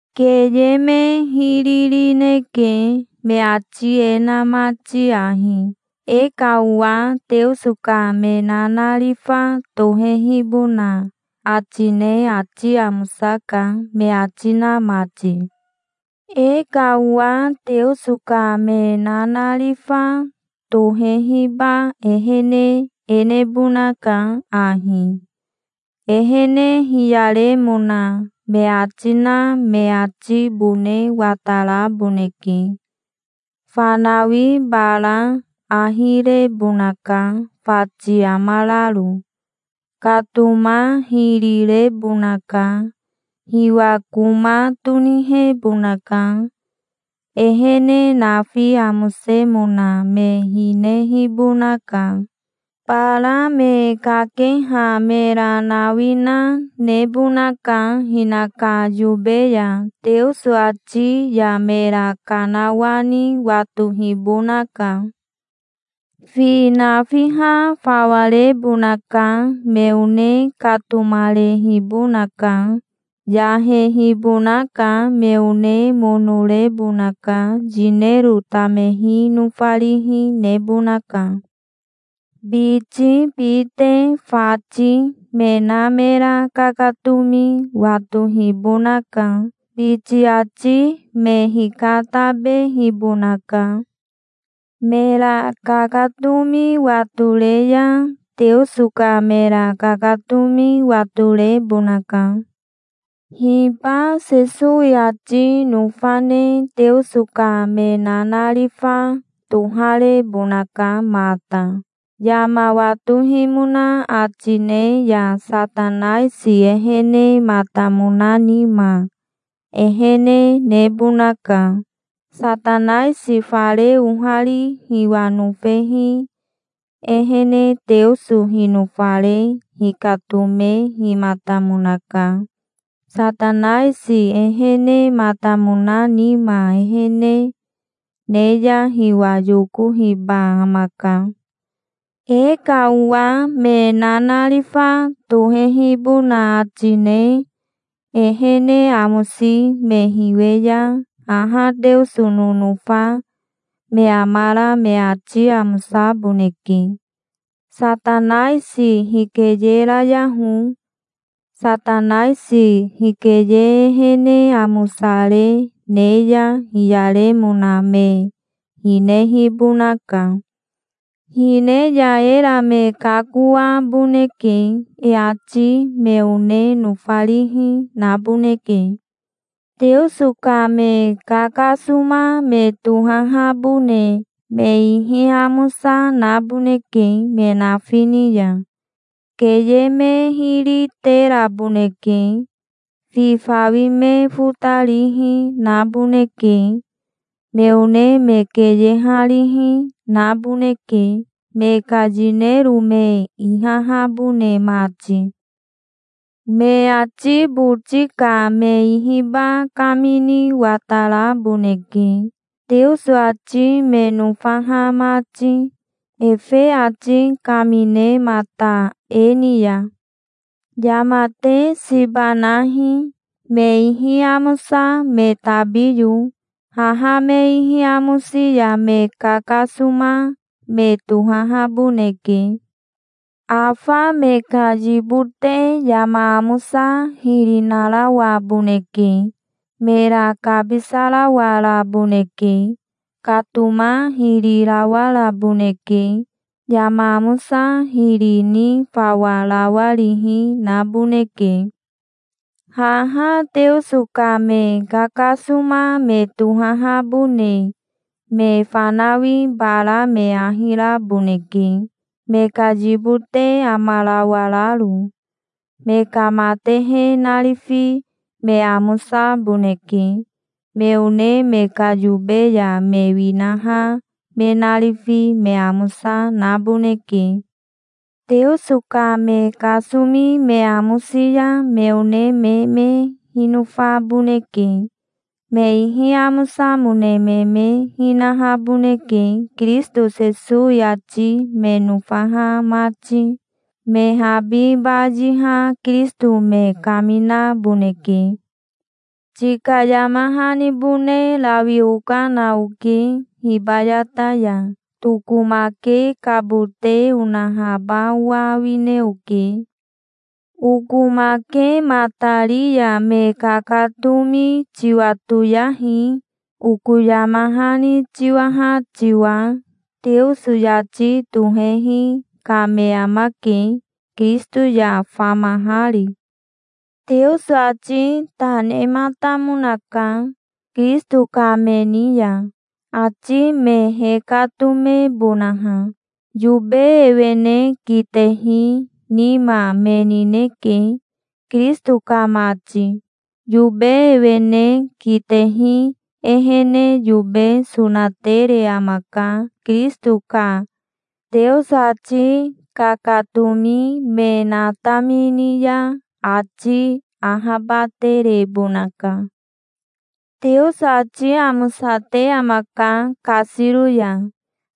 Keye me hiri rineke, me ati e na mati ahi: "E ka owa Teoso ka me nanarifa tohehibona ati ne ati amosaka", me ati na mati. E ka owa Teoso ka me nanarifa tohehiba ehene e nebonaka ahi: Ehene hiyaremona me ati na me atibone wataraboneke. Fanawi bara ahi rebonaka fati amararo. Katoma hiri rebonaka. Hiwa koma tonihebonaka. Ehene nafi amosemona me hinehibonaka. Bara me kakeha mera nawina nebonaka hinaka yobe ya. Teoso ati ya mera kanawani watohibonaka. Fi nafiha fawarebonaka. Me one katomarehibonaka. Yahehibonaka. Me one mono rebonaka. Yinero tamehi nofarihi nebonaka. Biti, bite, fati, me na mera kakatomi watohibonaka. Biti ati me hikatabehibonaka. Mera kakatomi watore ya, Teoso ka mera kakatomi watorebonaka. Hiba Sesowi ati nofa ne Teoso ka me nanarifa toharebonaka mata. Yama watohimona ati ne ya Satanaisi ehenematamona nima, ehene nebonaka. Satanaisi fare ohari hiwa nofehi ehene Teoso hinofare hikatomehimatamonaka. Satanaisi ehenematamona nima ehene ne ya hiwa yokohiba amaka. E ka owa me nanarifa tohehibona ati ne ehene amosi me hiwe ya haha Teoso nonofa me amara me ati amosaboneke. Satanaisi hikeyerayaho. Satanaisi hikeye ehene amosare ne ya hiyaremona me hinehibonaka. Hine ya era me kakoaboneke. E ati me one nofarihi, naboneke. Teoso ka me kakasoma me tohahabone me ihi amosa naboneke me nafi ni ya. Keye me hiri teraboneke. Fi fawi me fotarihi naboneke. Me one me keyeharihi, naboneke, me ka yinero me ihahabone mati. Me ati boti ka me ihiba kamini wataraboneke, Teoso ati me nofaha mati, efe ati kaminemata e ni ya. Yama te siba nahi, me ihi amosa tabiyo. Haha me ihi amosi ya me kakasoma me tohahaboneke. Afa me ka yibote yama amosa hiri narawaboneke. Mera kabisarawaraboneke. Katoma hiri rawaraboneke. Yama amosa hiri ni fawa rawarihi naboneke. Haha Teoso ka me kakasoma me tohahabone me fanawi bara me ahi raboneke me ka yibote amarawararo. Me ka matehe narifi me amosaboneke. Me one me ka yobe ya me winaha me narifi me amosa naboneke. Teoso ka me kasomi me amosi ya me one me me hinofaboneke. Me ihi amosamone me me hinahaboneke Kirisito Sesowi ati me nofaha mati. Me habi bayiha Kirisito me kaminaboneke. Tika yama hanibone rawi okana oke hibayata ya. Tokomakekabote onahaba owa awine oke. Okomakematari ya me kakatomi tiwatoyahi, oko yama hani tiwaha tiwa. Teoso yati tohehi ka me amake, Kirisito ya famahari. Teoso ati ta nematamonaka, Kirisito ka me ni ya, ati me hekatomebonaha. Yobe ewene kitehi nima me nineke, Kirisito ka mati. Yobe ewene kitehi ehene yobe sonatere amaka. Kirisito ka Teoso ati kakatomi me natamini ya ati ahabaterebonaka. Teoso ati amosate amaka kasiro ya,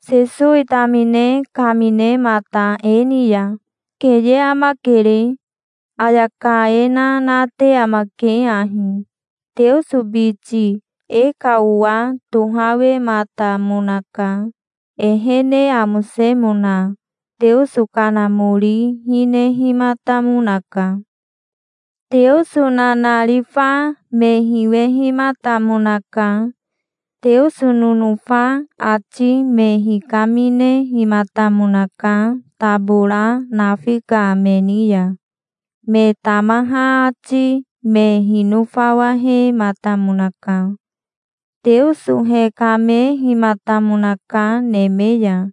Sesowi tamine kaminemata e ni ya. Keye amakere. Ayaka e na nate amake ahi: "Teoso biti e ka owa tohawematamonaka. Ehene amosemona Teoso Kanamori hinehimatamonaka. Teoso nanarifa me hiwehimatamonaka. Teoso nonofa ati me hikaminehimatamonaka tabora nafi ka me ni ya. Me tamaha ati me hinofawahematamonaka. Teoso hekamehimatamonaka neme ya,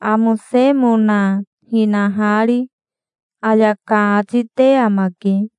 amosemona hinahari", ayaka ati te amake.